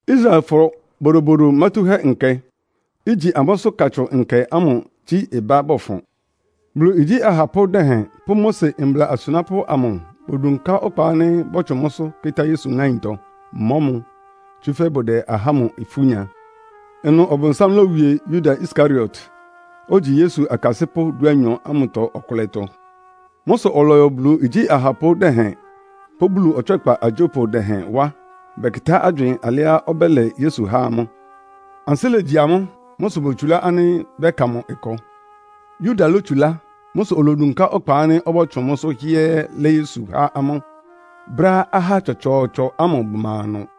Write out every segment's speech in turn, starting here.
Israelfɔ Bodobodo Mátúhɛ́Nkɛ, igyi amʋ́sʋ́ Katsʋn Nkɛ ámʋ gyí ɩbá bɔfʋn. Bulu igyí ahapʋ́ dɛhɛn pʋ́ Mose mbla asunápʋ́ amʋ bodunká ɔkpa ánɩ́ bɔ́tsʋn mʋ́sʋ́ kɩ́tá Yesu ŋáintɔ, mɔ́ mʋ, tsúfɛ́ bʋdɛ ahá ámʋ ifú nya. Ɩnʋ Ɔbʋnsám lówie Yuda Iskariot, ogyi Yesu akasɩ́pʋ́ dúanyɔ ámʋtɔ ɔkʋlɛtɔ. Mʋ́ sʋ ɔlɔyɔ Bulu igyí ahapʋ́ dɛhɛn pʋ́ Bulu ɔtswɛ́kpa agyópʋ dɛhɛn wá, bɛkɩtá agywɩɩn alɩá ɔbɛ́lɛ Yesu há amʋ́. Ansɩ́ légyi amʋ́. Mʋ́ sʋ botsulá ánɩ́ bɛ́ka mʋ ɩkɔ. Yuda lótsulá. Mʋ́ sʋ olodunká ɔkpa ánɩ́ ɔbɔ́tsʋn mʋ́sʋ́ hɩ́ɛ́ɛ́ lɛ́ Yesu há amʋ́, brɛ́á ahá tsɔtsɔɔtsɔ ámʋ bʋma ɩnʋ.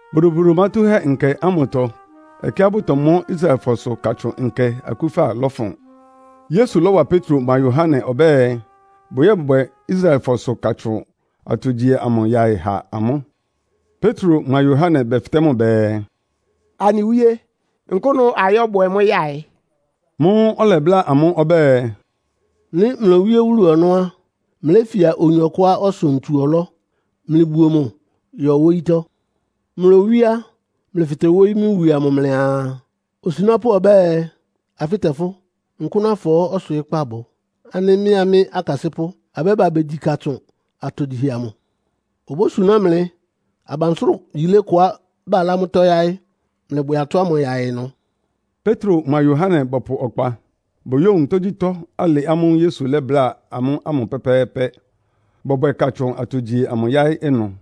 Bodobodo Mátúhɛ́Nkɛ ámʋtɔ ɛkɛá bʋtɔmɔ́ Israelfɔsʋ Katsʋn Nkɛ akúfa lɔfʋn. Yesu lɔ́wa Petro mʋa Yohane ɔbɛ́ɛ, bʋyɔ́bwɛ Israelfɔsʋ Katsʋn atogyihɛ amʋ yaɩ ha amʋ́. Petro mʋa Yohane bɛfɩtɛ́ mʋ bɛɛ, “Anɩ Wíé, nkʋ́nʋ ayɔ́bwɛ mʋ́ yaɩ?” Mʋ́ʋ́ ɔlɛbláa amʋ́ ɔbɛ́ɛ, “Nɩ́ mlowíé wúlu ɔnɔ́ á, mléfia oyin ɔkʋá ɔsʋ ntsu-ɔlɔ́. Mlɩbuo mʋ yɔ wóyítɔ́. Mlowíé á, mlɩfɩtɛ wóyí mʋ wie amʋ mlɩaa, ‘Osunápʋ́ ɔbɛ́ɛ, afɩ́tɛ fʋ́, nkʋ́nʋ afɔɔ́ ɔswɩɩ́kpá bʋ, ánɩ́ mɩ́a mɩ́ akasɩ́pʋ́ abɛ́ba begyi Katsʋn atogyihɛ amʋ?’ Obósuná mlɩ abansʋ́rʋ yílé kʋá balá mʋ́tɔ́ yáɩ́. Mlɩbwɛ atɔ́ ámʋ yaɩ ɩnʋ.” Petro mʋa Yohane bɔpʋ ɔkpa. Boyówun tógyítɔ́ alɩ ámʋ́ʋ́ Yesu lɛ́bláa amʋ́ ámʋ pɛ́pɛ́ɛ́pɛ́, bɔbwɛ Katsʋn atogyihɛ amʋ yáɩ́ ɩnʋ.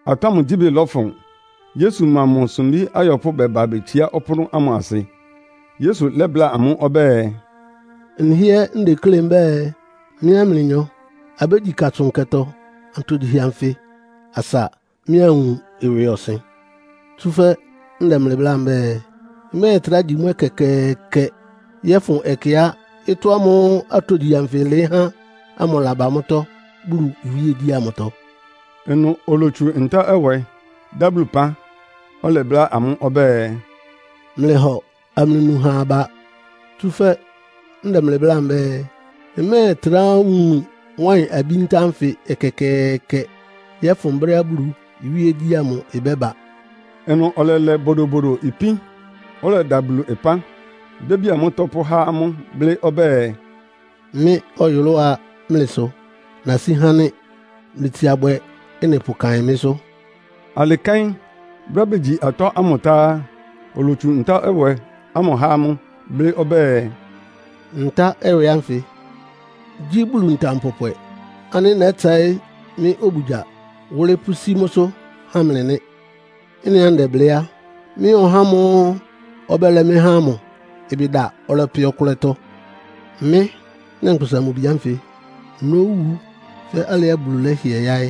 Atɔ́ ámʋ gyíbɩ lɔfʋn, Yesu mʋa mʋ sumbí ayɔpʋ́ bɛba betsiá ɔpʋ́nʋ́ ámʋ asɩ. Yesu lɛ́bláa amʋ́ ɔbɛ́ɛ, “Nhɩ́ɛ́ ndeklé mbɛ́ɛ, mɩ́a mlɩnyɔ abégyi Katsʋn Nkɛtɔ atogyihɛ anfɩ asa mɩ́ anwun ɩwɩɔsɩn. Tsúfɛ́ ndɛ mlɩ bláa mbɛ́ɛ, mmɛ́ɛtrá gyi mʋ́ ɛkɛkɛɛkɛ yɔ́fʋn ɛkɛá ɩtɔ́ ámʋ́ʋ́ atogyihɛ anfɩ ɩlɩɩ́ há ámʋ laba mʋ́tɔ́ Bulu iwíegyí amʋtɔ.” Ɩnʋ olotsu ntá-ɛwɛ, dá Bulu ɩpán, ɔlɛbláa amʋ́ ɔbɛ́ɛ, “Mlɩhɔ amlɩnu ha aba. Tsúfɛ́ ndɛ mlɩ bláa mbɛ́ɛ, mmɛ́ɛtrá nu wáɩn-abí ntá ánfɩ ɛkɛkɛɛkɛ yɔ́fʋn brɛ́á Bulu iwíegyí ámʋ ɩbɛ́ba.” Ɩnʋ ɔlɛlɛ bodobodo ipín, ɔlɛda Bulu ɩpán, bíábía mʋ́tɔ́ pʋ́há amʋ́, blɩ́ ɔbɛ́ɛ, “Mɩ́ ɔyʋlʋ́á mlɩ sʋ nasí há nɩ́. Mlɩtsia bwɛ ɩ́nɩ pʋkaɩn mɩ́sʋ́.” Alɩ kɛ́n, brɛ́á begyi atɔ́ ámʋ tá á, olotsu ntá-ɛwɛ ámʋ há amʋ́, blɩ́ ɔbɛ́ɛ, “Ntá-ɛwɛ ánfɩ gyí Bulu ntam pɔpwɛ ánɩ́ nɛ́tsɛɩ́ mɩ́ obugya wʋ́lɩ́ pʋ́sí mʋ́sʋ́ há mlɩ nɩ́. “Ɩ́nɩá ndɛblɩ́ á, mɩ́a ɔhá ámʋ́ʋ́ ɔbɛ́lɛ mɩ́ há ámʋ ɩbɩ da ɔlɛpɛ ɔkʋlɛtɔ. Mɩ́, Nyankpʋsa-Mʋ-Bi ánfɩ nówu fɛ́ alɩá Bulu lɛ́hɩɛ yáɩ́,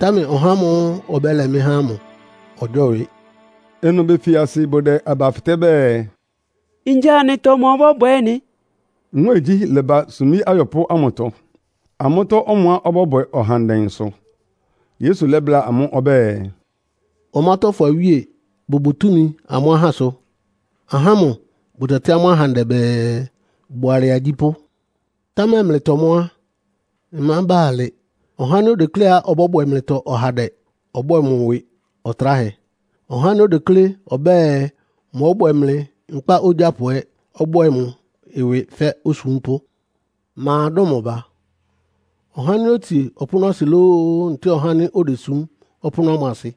támɛ ɔhá ámʋ́ʋ́ ɔbɛ́lɛ mɩ́ há ámʋ ɔgyɔ́wɩ.” Ɩnʋ befi asɩ bʋdɛ aba fɩtɛ́ bɛɛ, “Ngya anɩtɔ ma ɔbɔ́bwɛ ɩ́nɩ?” Nwɛ́ɛngyí lɛ́ba sumbí ayɔpʋ́ ámʋtɔ, amʋ́tɔ́ ɔmʋá ɔbɔ́bwɛ ɔhandɛ sʋ. Yesu lɛ́bláa amʋ́ ɔbɛ́ɛ, “Ɔmátɔ́fɔ awíe bʋbʋ túmi amʋ́ ahásʋ. Ahá ámʋ bʋtɛtɩ́ amʋ́ ahandɛ bɛɛ, ‘Bʋalɛ agyípʋ́.’ Támɛ mlɩtɔ mʋ́ á, ɩmába alɩ. Ɔhá ánɩ́ odekléá ɔbɔ́bwɛ mlɩtɔ ɔhandɛ ɔbwɛ́ɛ mʋ ɩwɩ ɔtráhɛ. Ɔhá ánɩ́ odeklé ɔbɛ́ɛ, mɔ́bwɛ mlɩ nkpá ogyápʋ ɛ́ ɔbwɛ́ɛ mʋ ɩwɩ fɛ́ osúmpʋ́. Ma dʋ́n mʋ ba? Ɔhá ánɩ́ otsie ɔpʋ́nʋ́asɩ lóó, ntɛ́ɛ ɔhá ánɩ́ odesúm ɔpʋ́nʋ́ ámʋ asɩ?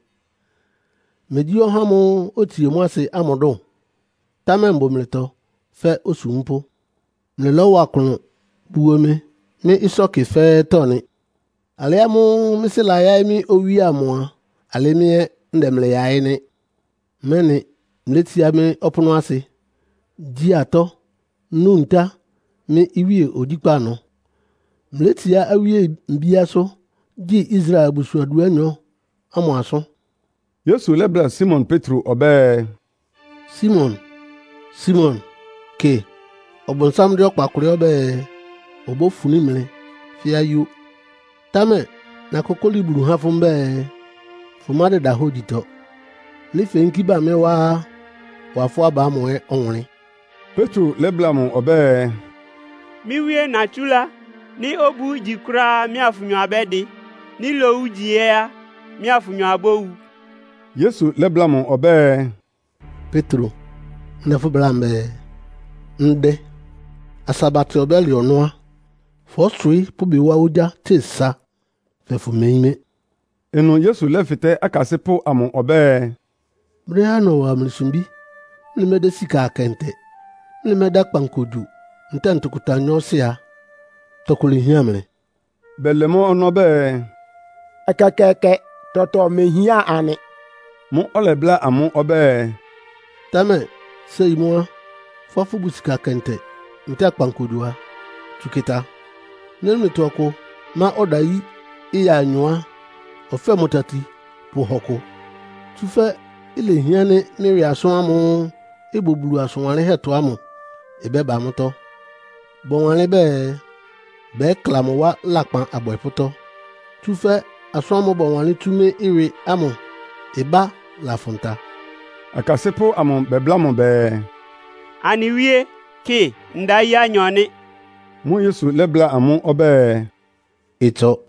Megyí ɔhá ámʋ́ʋ́ otsie mʋ́ asɩ ámʋ dʋn? Támɛ mbʋ mlɩtɔ fɛ́ osúmpʋ́. “Mlɩlɔ́wa klʋn buo mɩ mɩ́ ɩsɔ́kɩ fɛ́ɛ́tɔ́ nɩ. Alɩ ámʋ́ʋ́ mɩ́ Sɩ́ layáɩ́ mɩ́ owíe amʋ a, alɩ́ mɩ́ ɛ́ ndɛ mlɩ yaɩ́ nɩ́, mɛ́nɩ mlétsiá mɩ́ ɔpʋ́nʋ́asɩ, gyi atɔ́, nú ntá mɩ́ iwíe ogyíkpá ɩnʋ. Mlétsiá awíe mbíásʋ́, gyi Israel abusuan dúanyɔ ámʋ asʋ́n.” Yesu lɛ́bláa Simon Petro ɔbɛ́ɛ, “Simon, Simon! Kɩ, Ɔbʋnsám dɛ́ ɔkpa kʋlɩ́ ɔbɛ́ɛ, obófuní mlɩ fɛ́ ayó. Támɛ nakókóli Bulu há fʋ́ mbɛ́ɛ, fʋmádɩda hógyitɔ. Nɩ́ feyínkí ba mɩ́ wá á, wa fʋ́ aba ámʋ ɛ́ ɔwʋnlɩ́n.” Petro lɛ́bláa mʋ ɔbɛ́ɛ, “Mɩ́ Wíé natsúlá, nɩ́ obu igyi kʋ́ráá mɩ́a fʋnyɔ abɛ́dɩ. Nɩ́ lowu ígyi ɛ́ á, mɩ́a fʋnyɔ abówu.” Yesu lɛ́bláa mʋ ɔbɛ́ɛ, “Petro, ndɛ fʋ́ bláa mbɛ́ɛ, ndɛ, asa batɛ ɔbɛ́lɛ ɔnɔ́ á, fɔ́swɩɩ́ pʋ́ ɩbɩ wá ogyá tse sa fɛɛ fʋmeyín mɩ́.” Ɩnʋ Yesu lɛ́fɩtɛ́ akasɩ́pʋ́ amʋ ɔbɛ́ɛ, “Brɛ́á nɔwa mlɩ sumbí, mlɩmɛ́dɛ́ sika akɛntɛ, mlɩmɛ́dɛ́ akpankogyo ntɛ́ɛ ntʋkʋta nyɔɔsɩ a, tɔkʋ lehián mlɩ?” Bɛlɛ mʋ́ ɔnɔ́ bɛɛ, “Ɛkɛkɛɛkɛ! Tɔtɔ mehián anɩ.” Mʋ́ʋ́ ɔlɛbláa amʋ́ ɔbɛ́ɛ, “Támɛ séi mʋ́ á, fʋ́á fʋ́bʋ sika kɛntɛ, ntɛ́ɛ akpankogyo a, tsu kɩta. Nɩ́ mlɩtɔ ɔkʋ má ɔdayí ɩya anyɔ á, ɔfɛ́ mʋ tati pʋhɔ kʋ! Tsúfɛ́ ilehián ánɩ́ mɩ́ ɩwɩ asʋ́n ámʋ́ʋ́ ɩbʋ Bulu asʋn wanlɩ́nhɛ́tɔ ámʋ ɩbɛ́ba mʋ́tɔ́. Bɔwanlɩ́n bɛɛ, ‘Bɛkla mʋ wá lakpan abwɛpʋ́tɔ́.’ Tsúfɛ́ asʋ́n ámʋ́ʋ́ bɔwanlɩ́n tsú mɩ́ ɩwɩ ámʋ ɩbá lafʋn ta.” Akasɩ́pʋ́ amʋ bɛbláa mʋ bɛɛ, “Anɩ Wíe, kɩ, ndayí anyɔ nɩ́.” Mʋ́ʋ́ Yesu lɛ́bláa amʋ́ ɔbɛ́ɛ, “Ɩtsɔ.”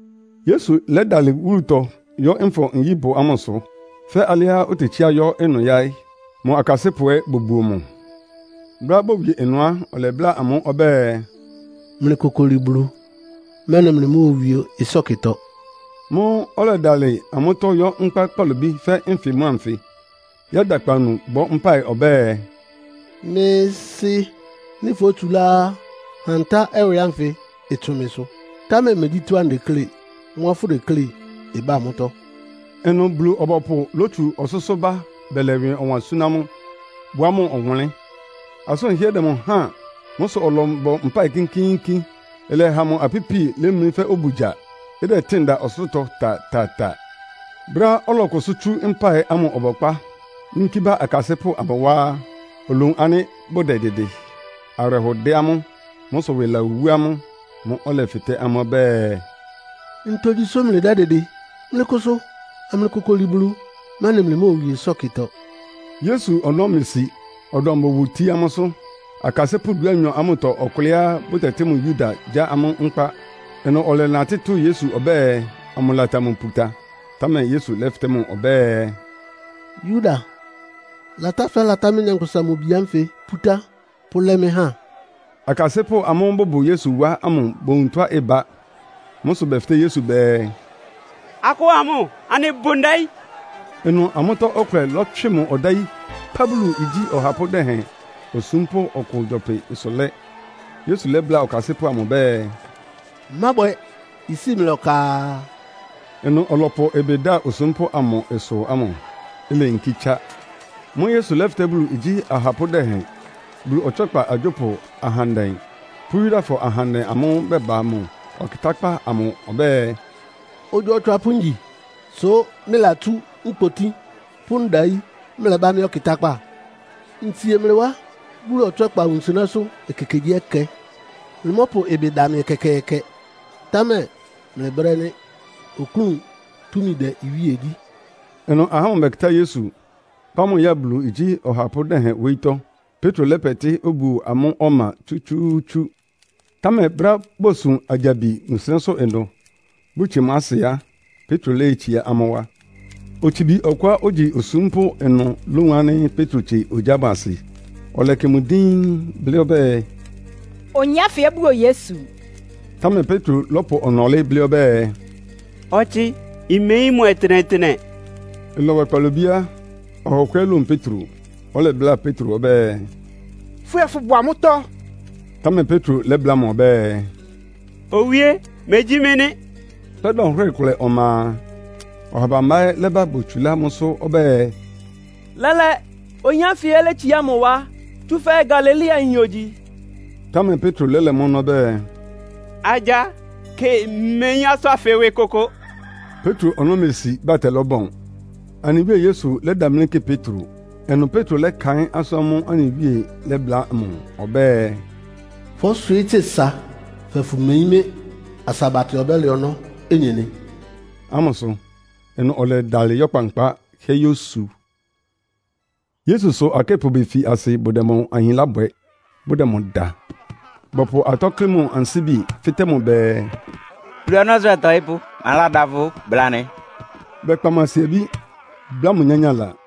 Yesu lɛ́dalɩ wúlutɔ yɔ́ Nfɔ-nyíbʋ ámʋsʋ, fɛ́ alɩá otetsíá yɔ́ ɩnʋ yáɩ́. Mʋ akasɩ́pʋ́ ɛ́ bobuo mʋ. Brɛ́á bowie ɩnʋ á, ɔlɛbláa amʋ́ ɔbɛ́ɛ, “Mlɩkokoli Bulu, mɛ́nɩ mlɩmóowie ɩsɔ́kɩtɔ.” Mʋ́ʋ́ ɔlɛdalɩ amʋ́tɔ́ yɔ́ nkpá kpalobí fɛ́ nfɩ mʋ́a nfɩ, yɛ́da akpawunu bɔ́ mpáɩ ɔbɛ́ɛ, “Mɩ́ Sɩ́, nɩ́ fótsulá á, ha ntá-ɛwɛ ánfɩ ɩtsʋn mɩsʋ. Támɛ megyí tɔ́á ndeklé, mʋ́a fʋdeklé ɩbá mʋ́tɔ́.” Ɩnʋ Bulu-ɔbɔpʋ lótsu ɔsʋ́sʋ́ bá bɛlɛ ɩwɩ ɔwan súná mʋ, wá mʋ ɔwʋnlɩ́n. Asʋ́n ɩhɩ́ɛ́ dɛ mʋ háan. Mʋ́ sʋ ɔlɔbɔ mpáɩ kínkíínkín. Ɩlɛha mʋ apípi lemlí fɛ́ obugya, ɩdɛtɩ́ɩn da ɔsʋlʋ́tɔ ta-ta-ta. Brɛ́á ɔlɔkʋsʋ́ tsú mpáɩ ámʋ ɔbɔkpá, yínkí ba akasɩ́pʋ́ amʋ wá á, olowun ánɩ́ bʋdɛdɩdɩ. Awɩrɛhɔ dɛ amʋ́. Mʋ́ sʋ ɩwɩ lawú amʋ́. Mʋ́ʋ́ ɔlɛfɩtɛ́ amʋ́ ɔbɛ́ɛ, “Ntogyi sʋ́ mlɩdɛ́dɩdɩ? Mlɩkʋsʋ amlɩkokoli Bulu, mɛ́nɩ mlɩmóowie ɩsɔ́kɩtɔ.” Yesu ɔnɔ́ mesi, ɔdɔm bowotií amʋ́sʋ́. Akasɩ́pʋ́ dúanyɔ ámʋtɔ ɔkʋlɛá bʋtɛtɩ́ mʋ Yuda gyá amʋ́ nkpá. Ɩnʋ ɔlɛnatɩ́ tʋ́ Yesu ɔbɛ́ɛ, amʋlata mʋ puta, támɛ Yesu lɛ́fɩtɛ́ mʋ ɔbɛ́ɛ, “Yuda, latá fɛ́latá mɩ́, Nyankpʋsa-Mʋ-Bi ánfɩ pútá, pʋ́lɛ́ mɩ́ há?” Akasɩ́pʋ́ amʋ́ʋ́ bʋbʋ Yesu wá ámʋ bowun tɔ́á ɩbá. Mʋ́ sʋ bɛfɩtɛ́ Yesu bɛɛ, “Akɔ́ɔ amʋ́? Anɩbʋ ndayí.” Ɩnʋ amʋ́tɔ́ ɔkʋlɛ lɔ́tswɩ mʋ ɔdayí kpá Bulu igyí ɔhapʋ́ dɛhɛn osúmpʋ́ ɔkʋ gyɔpɩ-ɩsʋ lɛ́. Yesu lɛ́bláa ɔkasɩ́pʋ́ amʋ ɔbɛ́ɛ, “Mábwɛ! Isíi mlɩ ɔka!” Ɩnʋ ɔlɔpʋ ɩbɩ da osúmpʋ́ amʋ ɩsʋ ámʋ, ileyinkí tsá. Mʋ́ʋ́ Yesu lɛ́fɩtɛ́ Bulu igyí ahapʋ́ dɛhɛn, Bulu ɔtswɛ́kpa agyópʋ ahandɛ pʋ́ Yudafɔ ahandɛ amʋ́ʋ́ bɛba mʋ ɔkɩtákpá amʋ ɔbɛ́ɛ, “Ogyo otswapʋ́ ngyi, sʋ́ mlɩlatsú nkpotí pʋ́ ndayí mlɛbá mɩ́ ɔkɩtákpá? Ntsie mlɩ wá Bulu ɔtswɛ́kpa wunsɩnɛ́sʋ́ ekekegyíɛkɛ, mlɩmɔ́pʋ ɩbɩ da mɩ ɛkɛkɛɛkɛ. Támɛ mlɩ brɛ́ nɩ́, oklún túmi dɛ́ iwíe gyí.” Ɩnʋ ahá ámʋ bɛkɩtá Yesu, kpá mʋ ya Bulu igyí ɔhapʋ́ dɛhɛn wóyítɔ́. Petro lɛ́pɛtɩ́ obuo amʋ́ ɔma tsútsúútsú. Támɛ brɛ́á bosun agyabi wunsɩnɛ́sʋ́ ɩnʋ, bʋtsie mʋ́ asɩ á, Petro léyétsiá amʋ́ wá. Otsibi ɔkʋá ogyi osúmpʋ́ ɩnʋ lówun ánɩ́ Petro tsie ogyá ámʋ asɩ, ɔlɛkɩ mʋ díín, blɩ́ ɔbɛ́ɛ, “Oyin ánfɩ ɛ́ buo Yesu!” Támɛ Petro lɔ́pʋ ɔnɔlɩ́ blɩ́ ɔbɛ́ɛ, “Ɔtsɩ, mmeyín mʋ ɔtɩnɛtɩnɛ!” Ɩlɔbwɛ kpalobí á, ɔha ɔkʋ ɛ́ lówun Petro, ɔlɛbláa Petro ɔbɛ́ɛ, “Fʋ́ ɛ́ fʋ́bʋ amʋ́tɔ́.” Támɛ Petro lɛ́bláa mʋ ɔbɛ́ɛ, “Owíé, megyí mɩ́ nɩ́!” Fɛ́ dɔnhwɩ́rɩ kʋlɛ ɔma a, ɔha bambá ɛ́ lɛ́ba botsulá mʋ́sʋ́ ɔbɛ́ɛ, “Lɛ́lɛ́, oyin ánfɩ ɛ́ létsiá mʋ wá, tsúfɛ́ Galileayin ogyi.” Támɛ Petro lɛ́lɛ mʋ́ ɔnɔ́ ɔbɛ́ɛ, “Agya! Kɩ, mmeyín asʋ́n ánfɩ ɩwɩ kʋkʋ.” Petro ɔnɔ́ mesi, batɛ lɔ́bɔn. Anɩ Wíe Yesu lɛ́damlí kɩ Petro. Ɩnʋ Petro lɛ́kaɩ́n asʋ́n ámʋ́ʋ́ anɩ Wíe lɛ́bláa mʋ ɔbɛ́ɛ, “Fɔ́swɩɩ́ tse sa fɛɛ fʋmeyín mɩ́ asa batɛ ɔbɛ́lɛ ɔnɔ́ onyenɩ.” ámʋsʋ. Ɩnʋ ɔlɛdalɩ yɔ́ kpankpá hɩ́ɛ́ yósu. Yesusʋ akɩ́pʋ befi asɩ bʋdɛ mʋ ahinlá bwɛ, bʋdɛ mʋ da. Bɔpʋ atɔ́ klɩ́ mʋ ansíbi, fɩ́tɛ́ mʋ bɛɛ, “Bulu ɔnɔ́sʋ́ ɔtɔɩ́pʋ́, maládá fʋ́? Bla anɩ.” Bɛkpa mʋ asiabí, bláa mʋ nyányála.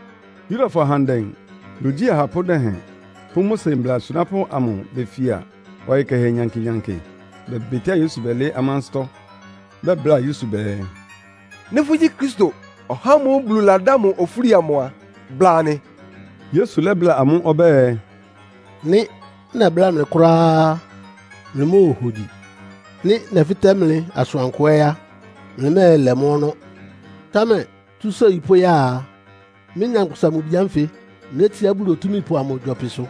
Yudafɔ ahandɛ, Bulu igyí ahapʋ́ dɛhɛn pʋ́ Mose mbla asunápʋ́ amʋ befia ɔyɩ kɛhɛ nyankɩ-nyankɩ, bɛbɩtɩ́a Yesu bɛlɩɩ́ amʋ́ ansɩ́tɔ́. Bɛbláa Yesu bɛɛ, “Nɩ́ fʋ́gyí Kristo, (ɔhá ámʋ́ʋ́ Bulu ladá mʋ ofúli amʋ) a, bla anɩ.” Yesu lɛ́bláa amʋ́ ɔbɛ́ɛ, “Nɩ́ nɛbláa mlɩ kʋ́ráá, mlɩmóohogyi. Nɩ́ nɛfɩtɛ́ mlɩ asʋankʋ ɛ́ á, mlɩmɛ́ɛlɛ mʋ́ ɔnɔ́. Támɛ tsú séi pʋ́ya a, mɩ́, Nyankpʋsa-Mʋ-Bi ánfɩ nétsiá Bulu Otúmípʋ amʋ gyɔpɩsʋ.”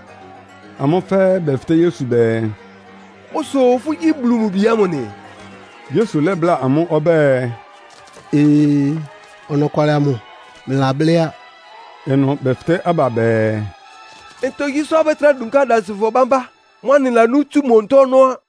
Amʋ́ fɛ́ɛ́ bɛfɩtɛ́ Yesu bɛɛ, “Mʋ́ sʋ fʋ́gyí Bulu mʋ Bi ámʋ nɩ?” Yesu lɛ́bláa amʋ́ ɔbɛ́ɛ, “Ee, ɔnɔkwalɩ amʋ mlɩlablɩ́ á.” Ɩnʋ bɛfɩtɛ́ aba bɛɛ, “Ntogyi sʋ́ abɛ́trá dunká adansɩfɔ bámbá? Mʋ́ anɩlanú tsú mʋ onutó ɔnɔ́ á.”